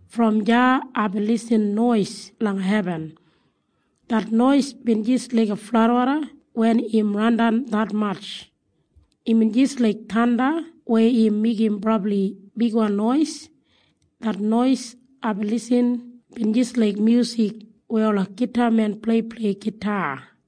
Brom deya aibin lisin nois langa hebin. Det nois bin jis laiga fladwoda wen im randan detmatj. Imbin jis laik thanda weya im meigim brabli bigwan nois. Det nois aibin lisin bin jis laik myusik weya ola gitamen pleiplei gita.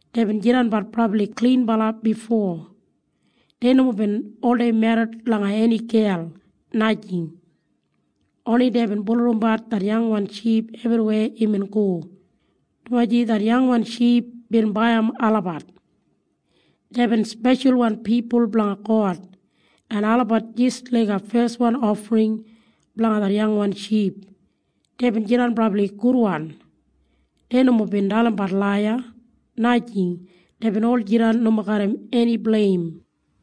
Deibin jidanbat brabli klinbala bifo. Dei nomo bin oldei merrit langa eni gel, najing. Oni deibin bulurrumbat det yangwan ship ebriweya imbin go, dumaji det yangwan ship bin baiyim olabat. Deibin speshalwan pipul blanga God, en olabat jis laiga feswan ofring blanga det yangwan ship. Deibin jidan brabli gudwan. Dei nomo bin dalimbat laiya, najing. Deibin ol jidan nomo garram eni bleim.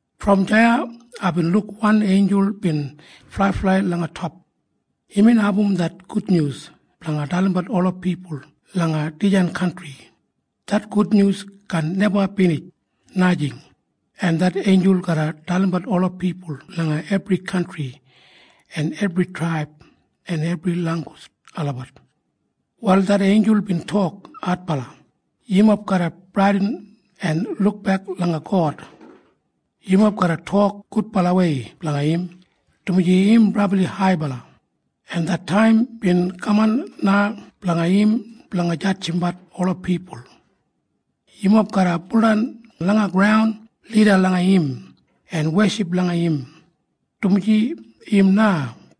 Brom deya aibin luk wanbala einjul bin flaiflai langa top. Imbin abum det gudnyus blanga dalimbat ola pipul langa dijan kantri. Det gudnyus kaan neba binij, najing. En det einjul garra dalimbat ola pipul langa ebri kantri en ebri traib en ebri langgus olabat. Wal det einjul bin tok adbala, “Yumob garra bradin en lukbek langa God. Yumob garra tok gudbalawei blanga im, dumaji im brabli haibala, en det taim bin kaman na blanga im blanga jadjimbat ola pipul. Yumob garra baudan langa graun lida langa im en weship langa im, dumaji im na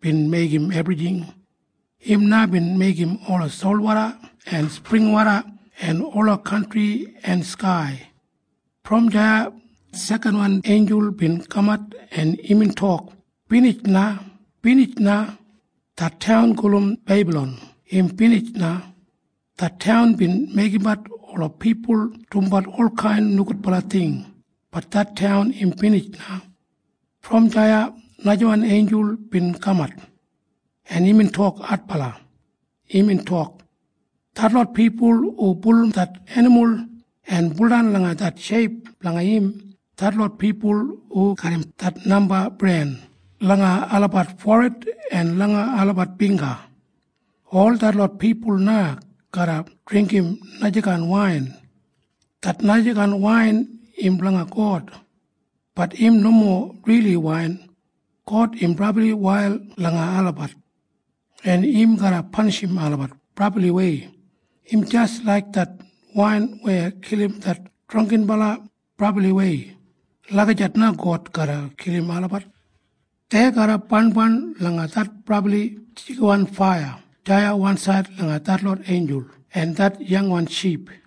bin meigim ebrijing. Im na bin meigim ola solwoda en springwoda en ola kantri en skai.” Brom deya sekanwan einjul bin kamat, en imbin tok, “Binij na! Binij na! Det taun gulum Bebalon im binij na! Det taun bin meigimbat ola pipul dumbat olkain nogudbala ting. Bat det taun im binij na!” Brom deya najawan einjul bin kamat, en imbin tok adbala. Imbin tok, “Detlot pipul hu bulurrum det enimul en weship langa det sheip blanga im, detlot pipul hu garram det namba bren langa olabat forid en langa olabat bingga, ol detlot pipul na garra dringgim najakain wain. Det najakain wain im blanga God. Bat im nomo rili wain. God im brabli wail langa olabat, en im garra panishim olabat brabliwei. Im jis laik det wain weya kilim det drangginbala brabliwei. Lagijat na God garra kilim olabat. Dei garra barnbarn langa det brabli jigiwan faiya deya wansaid langa detlot einjul en det yangwan ship.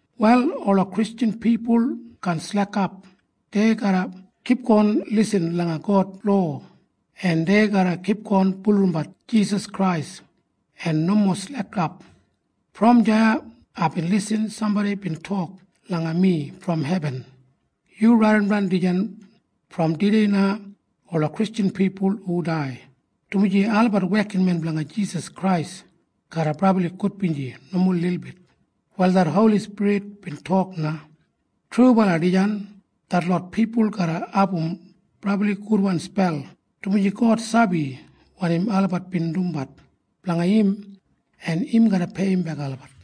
Wal ola Kristjan pipul kaan slekap. Dei garra kipgon lisin langa God lowa, en dei garra kipgon bulurrumbat Jisas Krais en nomo slekap. Brom deya aibin lisin sambodi bin tok langa mi brom hebin, “Yu raidimdan dijan. Brom tudei na ola Kristjan pipul hu dai, dumaji olabat wekinmen blanga Jisas Krais garra brabli gudbinji nomo lilbit.” Wal det Holi Spirit bin tok na, “Trubala dijan. Detlot pipul garra abum brabli gudwan spel, dumaji God sabi wanim olabat bin dumbat blanga im, en im garra peiyimbek olabat.”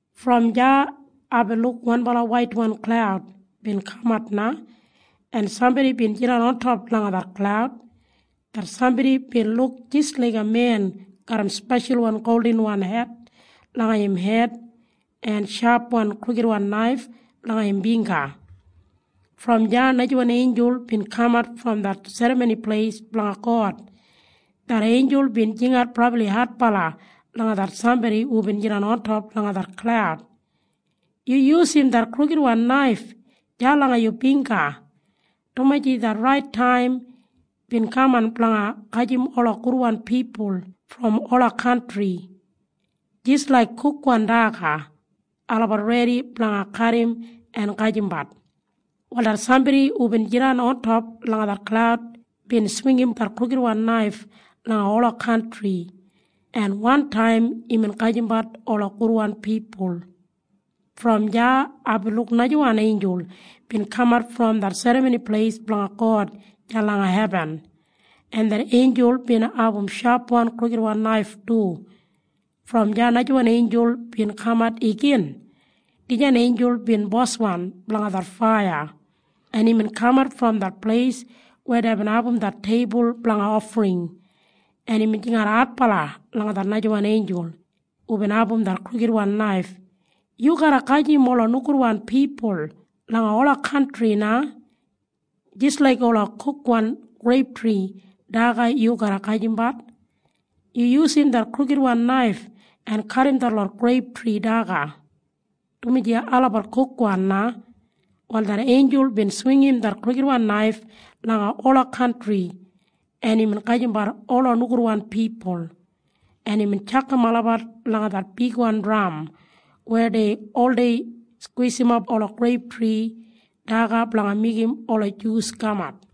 Brom deya aibin luk wanbala waitwan klaud bin kamat na, en sambodi bin jidan ontop langa det klaud. Det sambodi bin luk jis laiga men garram speshalwan goldinwan het langa im hed en shapwan krukidwan naif langa im bingga. Brom deya najawan einjul bin kamat brom det serramoni pleis blanga God. Det einjul bin jingat brabli adbala langa det sambodi hubin jidan ontop langa det klaud, “Yu yusum det krukidwan naif deya langa yu bingga, dumaji det rait taim bin kaman blanga gajim ola gudwan pipul brom ola kantri. Jis laik kukwan daga olabat redi blanga kadim en gajimbat.” Wal det sambodi hubin jidan ontop langa det klaud bin swingim det krukidwan naif langa ola kantri, en wantaim imbin gajimbat ola gudwan pipul. Brom deya aibin luk najawan einjul bin kamat brom det serramoni pleis blanga God deya langa hebin, en det einjul bin abum shapwan krukidwan naif du. Brom deya najawan einjul bin kamat igin. Dijan einjul bin boswan blanga det faiya, en imbin kamat brom det pleis weya deibin abum det teibul blanga ofring, en imbin jingat adbala langa det najawan einjul hubin abum det krukidwan naif, “Yu garra gajim ola nogudwan pipul langa ola kantri na. Jis laik ola kukwan greiptri daga yu garra gajimbat. Yu yusum det krukidwan naif en kadim detlot greiptri daga, dumaji olabat kukwan na.” Wal det einjul bin swingim det krukidwan naif langa ola kantri, en imbin gajimbat ola nogudwan pipul, en imbin tjakam olabat langa det bigwan dram weya dei oldei skwisimap ola greiptri daga blanga meigim ola jus kamat.